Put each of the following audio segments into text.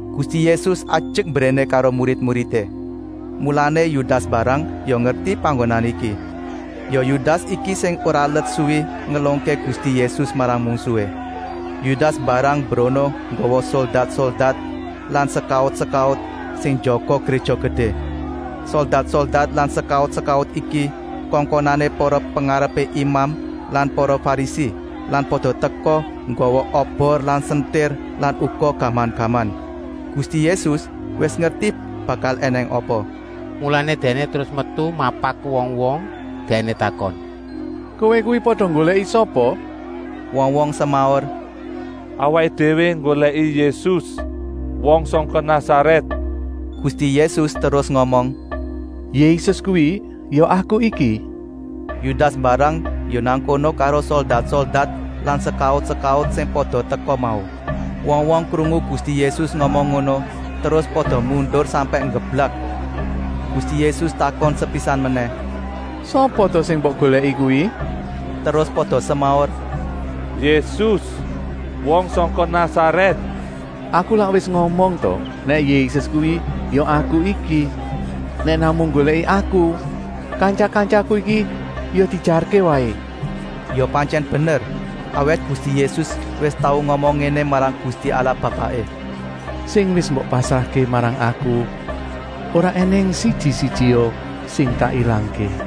Gusti Yésus ajek mbréné karo murid-muridé, mulané Yudas mbarang ya ngerti panggonan iki. Ya Yudas iki sing ora let suwi ngelungké Gusti Yésus marang mungsuhé. Yudas mbarang mbrono nggawa soldat-soldat lan sekaut-sekaut sing njaga Gréja Gedé. Soldat-soldat lan sekaut-sekaut iki kongkonané para pengarepé imam lan para Farisi lan pada teka nggawa obor lan sentir lan uga gaman-gaman. Gusti Yésus wis ngerti bakal ènèng apa, mulané Dèkné terus metu mapak wong-wong. Dèkné takon: “Kowé kuwi pada nggolèki sapa?” Wong-wong semaur: “Awaké déwé nggolèki Yésus, wong sangka Nasarèt!” Gusti Yésus terus ngomong: “Yésus kuwi ya Aku iki!” Yudas mbarang ya nang kono karo soldat-soldat lan sekaut-sekaut sing pada teka mau. Wong-wong krungu Gusti Yésus ngomong ngono terus pada mundur sampèk nggeblak. Gusti Yésus takon sepisan menèh: “Sapa ta sing mbok golèki kuwi?” Terus pada semaur: “Yésus, wong sangka Nasarèt!” “Aku lak wis ngomong ta nèk Yésus kuwi ya Aku iki. Nèk namung nggolèki Aku, kantya-kantyaku iki ya diejarké waé.” Ya pantyèn bener, awit Gusti Yésus wis tau ngomong ngéné marang Gusti Allah Bapaké: “Sing wis mbok pasrahké marang Aku ora ènèng siji-sijia sing tak ilangké!”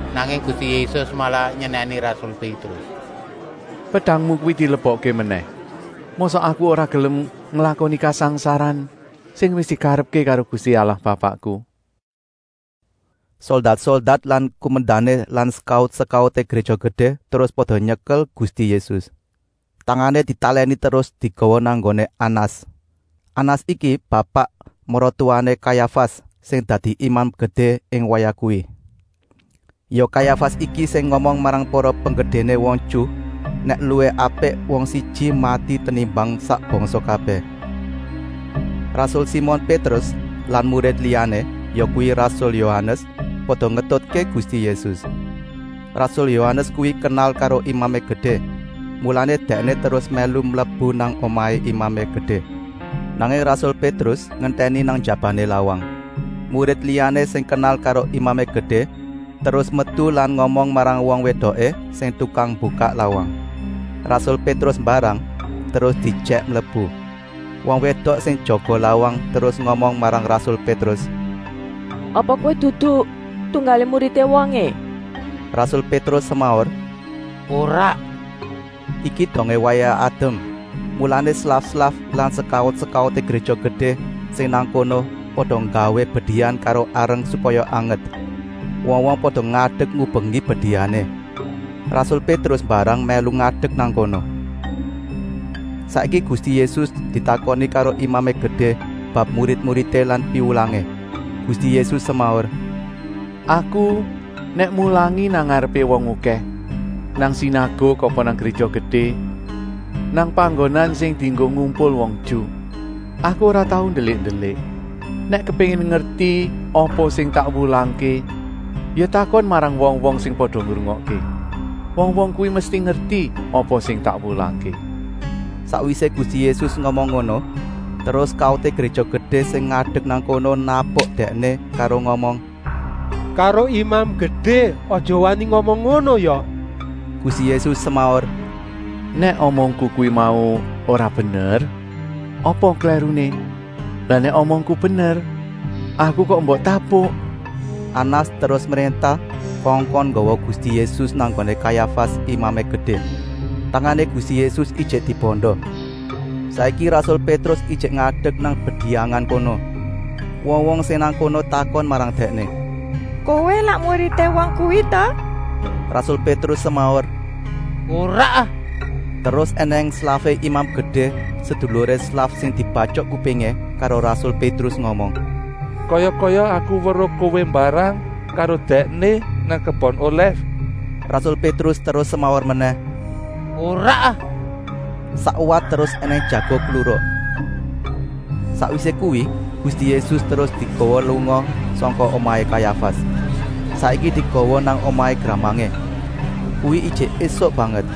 Nanging Gusti Yésus malah nyenèni rasul Pétrus: “Pedangmu kuwi dilebokké menèh! Mosok Aku ora gelem nglakoni kasangsaran sing wis dikarepké karo Gusti Allah Bapakku?” Soldat-soldat lan kumendané lan sekaut-sekauté Gréja Gedé terus pada nyekel Gusti Yésus. Tangané ditalèni terus digawa nang nggoné Anas. Anas iki bapak maratuwané Kayafas, sing dadi Imam Gedé ing wayah kuwi. Ya Kayafas iki sing ngomong marang para penggedéné wong Ju nèk luwih apik wong siji mati tenimbang sak bangsa kabèh. Rasul Simon Pétrus lan murid liyané, yakuwi rasul Yohanes, pada ngetutké Gusti Yésus. Rasul Yohanes kuwi kenal karo Imamé Gedé, mulané dèkné terus mèlu mlebu nang omahé Imamé Gedé. Nanging rasul Pétrus ngentèni nang njabané lawang. Murid liyané sing kenal karo Imamé Gedé terus metu lan ngomong marang wong wédoké sing tukang mbukak lawang. Rasul Pétrus mbarang terus diejèk mlebu. Wong wédok sing jaga lawang terus ngomong marang rasul Pétrus: “Apa kowé dudu tunggalé muridé wongé?” Rasul Pétrus semaur: “Ora!” Iki dongé wayah adem, mulané slaf-slaf lan sekaut-sekauté Gréja Gedé sing nang kono pada nggawé bediyang karo areng supaya anget. Wong-wong pada ngadek ngubengi bediyangé. Rasul Pétrus mbarang mèlu ngadek nang kono. Saiki Gusti Yésus ditakoni karo Imamé Gedé bab murid-muridé lan piwulangé. Gusti Yésus semaur: “Aku nèk mulangi nang ngarepé wong okèh, nang sinaguk apa nang Gréja Gedé, nang panggonan sing dienggo ngumpul wong Ju. Aku ora tau ndelik-ndelik. Nèk kepéngin ngerti apa sing tak wulangké ya takon marang wong-wong sing pada ngrungokké. Wong-wong kuwi mesti ngerti apa sing tak wulangké.” Sakwisé Gusti Yésus ngomong ngono terus sekauté Gréja Gedé sing ngadek nang kono napuk Dèkné karo ngomong: “Karo Imam Gedé aja wani ngomong ngono ya!” Gusti Yésus semaur: “Nèk omongku kuwi mau ora bener, apa klèruné? Lah nèk omongku bener, Aku kok mbok tapuk?” Anas terus mréntah kongkon nggawa Gusti Yésus nang nggoné Kayafas, Imamé Gedé. Tangané Gusti Yésus ijik dibanda. Saiki rasul Pétrus ijik ngadek nang bediyangan kono. Wong-wong sing nang kono takon marang dèkné: “Kowé lak muridé wong kuwi ta?” Rasul Pétrus semaur: “Ora ah!” Terus ènèng slafé Imam Gedé, seduluré slaf sing dibatyok kupingé karo rasul Pétrus, ngomong: “Kaya-kaya aku weruh kowé mbarang karo Dèkné nang kebon olèf!” Rasul Pétrus terus semaur menèh: “Ora ah!” Sakwat terus ènèng jago kluruk. Sakwisé kuwi Gusti Yésus terus digawa lunga sangka omahé Kayafas. Saiki digawa nang omahé gramangé. Kuwi ijik ésuk banget.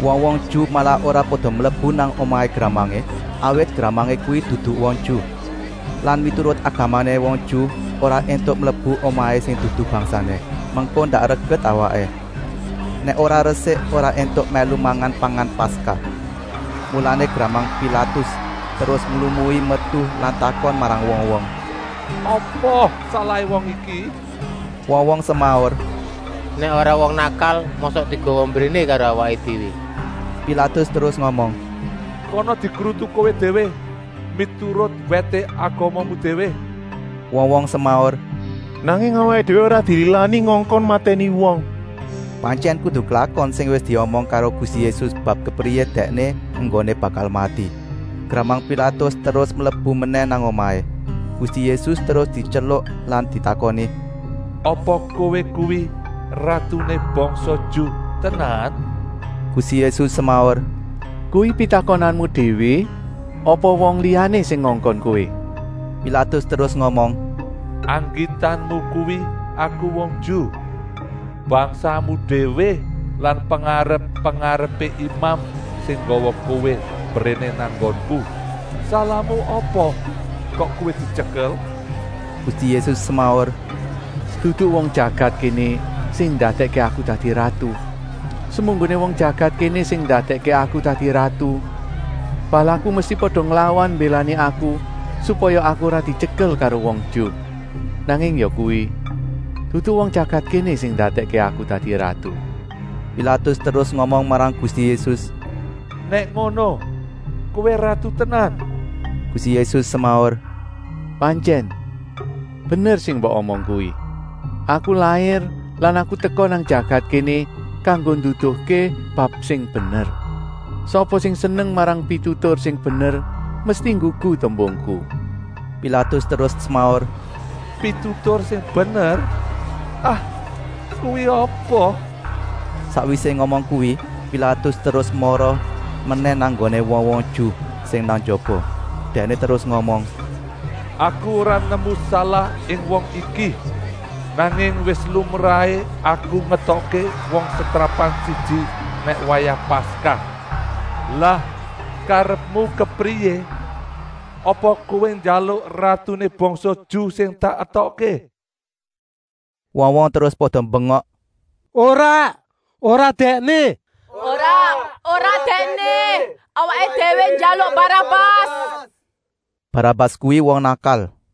Wong-wong Ju malah ora pada mlebu nang omahé gramangé, awit gramangé kuwi dudu wong Ju. Lan miturut agamané wong Ju ora éntuk mlebu omahé sing dudu bangsané, mengko ndak reget awaké. Nèk ora resik ora éntuk mèlu mangan pangan Paskah. Mulané gramang Pilatus terus nglumui metu lan takon marang wong-wong: “Apa salahé wong iki?” Wong-wong semaur: “Nèk ora wong nakal mosok digawa mbréné karo awaké déwé!” Pilatus terus ngomong: “Kana dikrutu kowé déwé miturut wèté agamamu déwé!” Wong-wong semaur: “Nanging awaké déwé ora dililani ngongkon matèni wong!” Pantyèn kudu klakon sing wis diomong karo Gusti Yésus bab kepriyé Dèkné enggoné bakal mati. Gramang Pilatus terus mlebu menèh nang omahé. Gusti Yésus terus dityeluk lan ditakoni: “Apa Kowé kuwi ratuné bangsa Ju tenan?” Gusti Yésus semaur: “Kuwi pitakonanmu déwé apa wong liyané sing ngongkon kowé?” Pilatus terus ngomong: “Anggitanmu kuwi aku wong Ju? Bangsamu déwé lan pengarep-pengarepé imam sing nggawa kowé mbréné nang nggonku! Salahmu apa kok kowé dityekel!” Gusti Yésus semaur: “Dudu wong jagat kéné sing ndadèkké Aku dadi ratu. Semunggoné wong jagat kéné sing ndadèkké Aku dadi ratu, balaku mesti pada nglawan mbélani Aku supaya Aku ora dityekel karo wong Ju. Nanging yakuwi, dudu wong jagat kéné sing ndadèkké Aku dadi ratu.” Pilatus terus ngomong marang Gusti Yésus: “Nèk ngono Kowé ratu tenan?” Gusti Yésus semaur: “Pantyèn, bener sing mbok omong kuwi. Aku lair lan Aku teka nang jagat kéné kanggo nduduhké bab sing bener. Sapa sing seneng marang pitutur sing bener mesti nggugu tembungku.” Pilatus terus semaur: “Pitutur sing bener? Ah, kuwi apa!” Sakwisé ngomong kuwi Pilatus terus mara menèh nang nggoné wong-wong Ju sing nang njaba. Dèkné terus ngomong: “Aku ora nemu salah ing wong iki! Nanging wis lumrahé aku ngetokké wong setrapan siji nèk wayah Paskah. Lah karepmu kepriyé? Apa kowé njaluk ratuné bangsa Ju sing tak etokké?” Wong-wong terus pada mbengok: “Ora, ora Dèkné! Awaké déwé njaluk Barabas!” Barabas kuwi wong nakal.